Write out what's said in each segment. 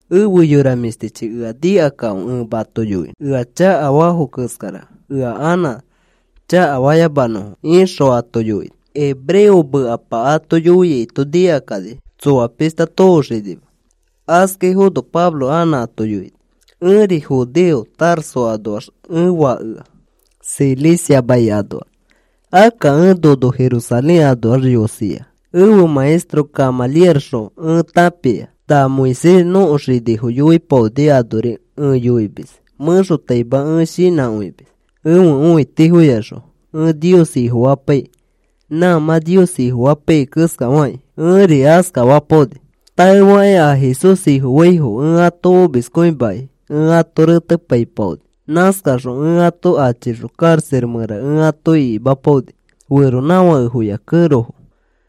“Efe yora mĩshtichi, ea nikakãfe ẽ mato yoinõ ea chakafafo keskara, ea anã chakafayamanõfo,” ixõ ato yoini. Hebreo mekapa ato yoiaito nikakani, tsoa pishta tooxinima. Askaifono Pablo anã ato yoini, “Ẽri judeo. Tarso anoax ẽ fakea, Cilicia mai anoax. Akka ẽ nono Jerusalén anoax yosia, ẽfe maestro Gamalielxõ ẽ tãpia. Na Moisés nõko xinifo yoipaoni anori ẽ yoimis. Mẽxotaima ẽ shinãkõimis ẽfe õitifoyaxõ ẽ Nios Ifofapaikĩ. Nã mã Nios Ifofapaiyai keskafakĩ ẽri askafapaoni. Taefakĩ a Jesús Ifofaifo ẽ ato omiskõimakĩ ẽ ato retepaipaoni. Nãskaxõ ẽ ato achixõ karaxa mẽra ẽ ato ikimapaoni, feronãfakefoya kẽrofo.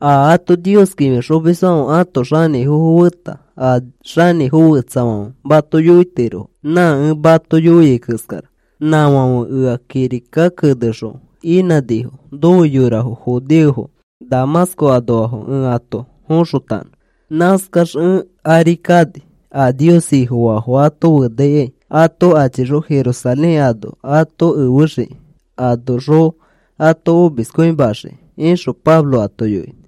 A ato Nios kĩfixomisfãfe ãto xanĩfofo feta a xanĩfo fetsafãfe mato yoitirofo nã ẽ mato yoiai keskara. Nãfãfe ea kirika kenexõ inãnifo, nofe yorafo judeofo Damasco anoafo ẽ ato foxotanõ. Nãskax ẽ ari kani a Nios Ifofaafo ato fenaikai, ato achixõ Jerusalén ano ato efexiki anoxõ ato omiskõimaxiki,” ixõ Pablo ato yoini.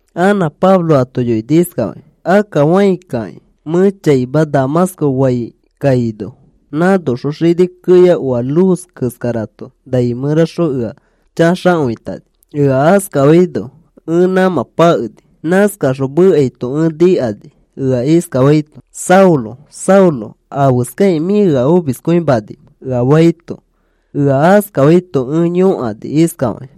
Anã Pablo ato yoini iskafakĩ: “Akka fãi kaikĩ mẽ chaima Damasco faikaino, nãnoxõ xini keya oa luz keskarato nai mẽraxõ ea chaxakõitani. Ea askafaino ẽ nãmã pakeni. Nãskaxõ mekaito ẽ nikani, ea iskafaito: ‘Saulo, Saulo, ¿afeskakĩ mĩ ea omiskõimanimẽ?’ ea faito. Ea askafaito ẽ yõkani iskafakĩ: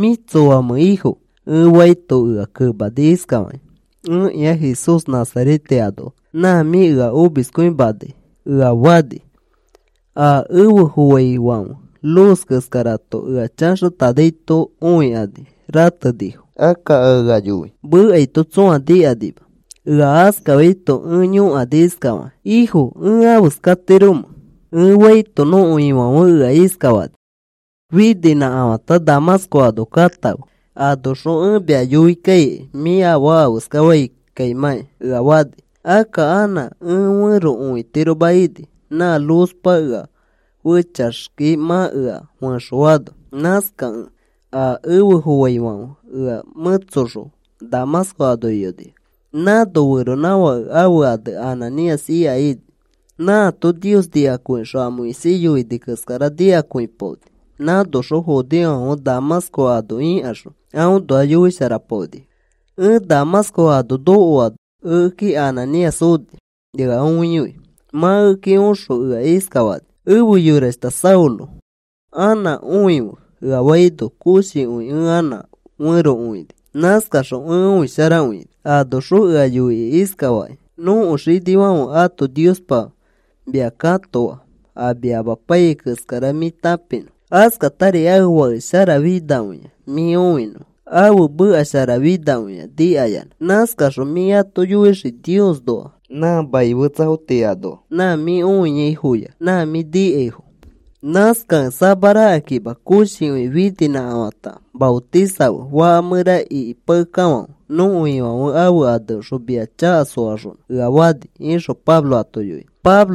‘¿Mĩ tsoamẽ, Ifo?’ ẽ faito ea kemani iskafakĩ: ‘Ẽkĩa Jesús Nazarete anoa, nã mĩ ea omiskõimanai,’ ea fani. A efe foaifãfe luz keskarato ea chaxatanaito õikani ratenifo. Akka a ea yoi mekaito tsõa nikanima. Ea askafaito ẽ yõkani iskafakĩ: ‘¿Ifo, ẽ afeskatiromẽ?’ ẽ faito, nõko Ifãfe ea iskafani: ‘Fininãkafãta Damasco ano katãfe. Anoxõ ẽ mia yoi kaikai mĩ afaa afeskafaimãkai,’ ea fani. Akka anã ẽ fẽro õitiroma ini, nã luzpa ea fechaxki mã ea fẽxoano. Nãskakẽ a efe foaifãfe ea mẽtsoxõ Damasco ano iyonifo. “Nãno feronãfake ãfe ane Ananías ika ini. Nãato Nios nikakõixõ a Moisés yoini keskara nikakõipaoni. Nãnoxõ judeofãfe Damasco ano ikaxõ aõnoa yoisharapaonifo. Ẽ Damasco ano nokoano ekeki Ananías oni ea õiyoi. Mã ekeki oxõ ea iskafani: ‘Efe yorashta Saulo, anã õife,’ ea faino koshikõi ẽ anã fẽro õini. Nãskaxõ ẽ õisharakõini. Anoxõ ea yoini iskafakĩ: ‘Nõko xinifãfe ãto Niospa mia katoa, a mia amapaiyai keskara mĩ tãpinõ. Askatari ãfe Fake sharafinakõia mĩ õinõ, ãfe meka sharafinakõia nikayanã. Nãskaxõ mĩ ato yoixii Niosnoa, nã maniafo tii anoa, nã mĩ õiaifoya, nã mĩ nikaifo. Nãskakẽ samarakakima koshikõi fininãkafãta maotisafe faka mẽra ikipakekafãfe nõko Ifãfe ãfe aneõxõ mia chaka soaxonõ,’ ea fani” ixõ Pablo ato yoini.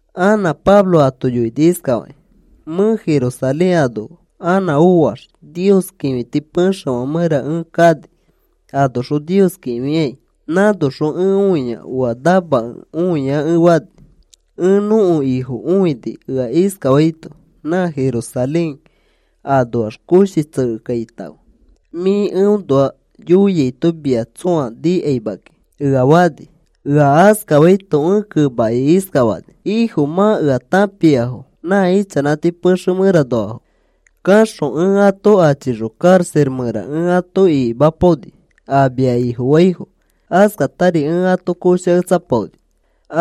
Anã Pablo ato yoini iskafakĩ: “Mẽ Jerusalén ano anã oax, Nios kĩfiti pexefã mẽra ẽ kani anoxõ Nios kĩfikai. Nãnoxõ ẽ õia oa namakẽ õia ẽ fani. Ẽ nõko Ifo õini ea iskafaito: ‘Nã Jerusalén anoax koshi tsekekaitãfe, mĩ eõnoa yoiaito mia tsõa nikaima kiki,’ ea fani. Ea askafaito ẽ kemakĩ iskafani: ‘Ifo, mã ea tãpiafo nã ichanãti pexe mẽranoafo kaxõ ẽ ato achixõ karaxa mẽra ẽ ato ikimapaoni a mia Ifofaifo. Askatari ẽ ato koshaketsapaoni.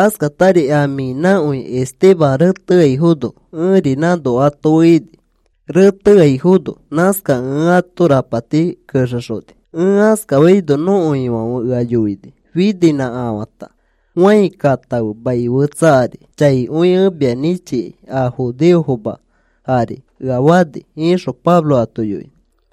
Askatari a mĩ inakõi Esteban reteaifono, ẽri nãno ato fe ini reteaifono. Nãskaxõ ẽ ato rapati kexexoni.’ Ẽ askafaino nõko Ifãfe ea yoini: ‘Fininãkafãta fãi katãfe, mai fetsafo ari chaikõi ẽ mia nĩchikai a judeofoma ari,’ ea fani,” ixõ Pablo ato yoini.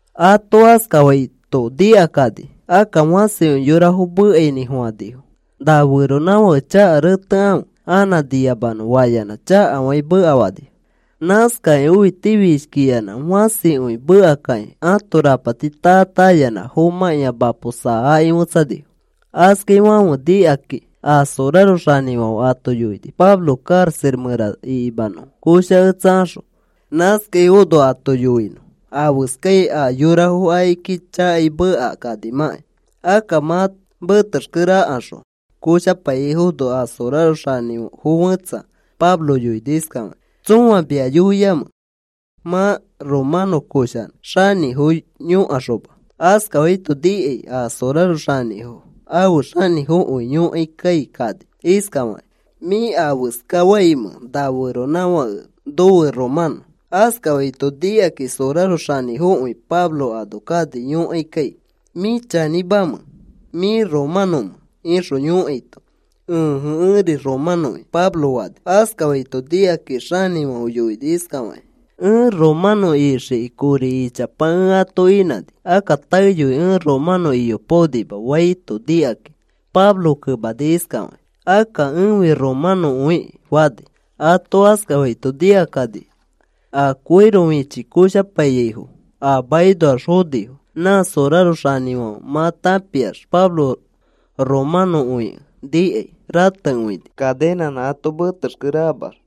Ato askafaito nikakani, akka fãsikõi yorafo mekainĩfofãnifo: “Na feronãfake chaka retefe anã niyamanõ,” fayanã chakafakĩ mekafanifo. Nãskakakĩ õitifishkikĩ finayanã fãsikõi mekakakĩ ãto rapati taa taa ayanã fomãkĩa mapo saakĩ fetsanifo. Askafaifãfe nikakĩ a soraro xanĩfãfe ato yoini Pablo karaxa mẽra ikimanõfo, koshaketsakaxõ, nãskafaifono ato yoinõ afeskai a yorafo akiki chakai mekakanimãkai. Akka mã metexkereakaxõ koshapaiyaifono, a soraro xanĩfo fẽtsa Pablo yoini iskafakĩ: “¿Tsõa mia yoiamẽ mã romanõ koshanõ xanĩfo yõkaxoma?” Askafaito nikai a soraro xanĩfo ãfe xanĩfokõi yoikai kani iskafakĩ: “¿Mĩ afeska faimẽ, na feronãfakeri nofe romanõ?” Askafaito nikakĩ soraro xanĩfokõi Pablo ano kani yõkaikai. “¿Mĩ chanĩmamẽ mĩ romanõmẽ?” ixõ yõkaito, “Ẽje, ẽri romanõki,” Pablo fani. Askafaito nikakĩ a xanĩfãfe yoini iskafakĩ: “Ẽ romanõ ixiki kori ichapa ẽ ato inãni, akka taeyoi ẽ romanõ iyopaonima,” faito nikaki, Pablo kemani iskafakĩ: “Akka ẽfi romanõkõiki,” fani. Ato askafaito nikakani a koiro fichi koshapaiyaifo a makinoax fonifo. Nã soraro xanĩfãfe mã tãpiax Pablo romanõkõikẽ nikai ratekõini cadenãnã ato metexkerekamax.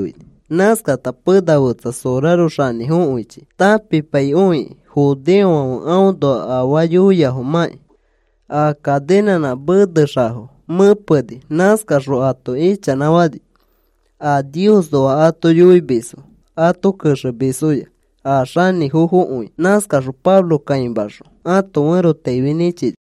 Nãskata pena fetsa soraro xanĩfokõichi tãpipaikõikĩ judeofãfe aõnoa afaa yoiafomãkĩ, a cadenãnã menexafo mẽpeni. Nãskaxõ ato ichanãfani a Niosnoa ato yoimisfo ato kexemisfoya, a xanĩfokõifo. Nãskaxõ Pablo kãimaxõ ãto ferotaifi nĩchini.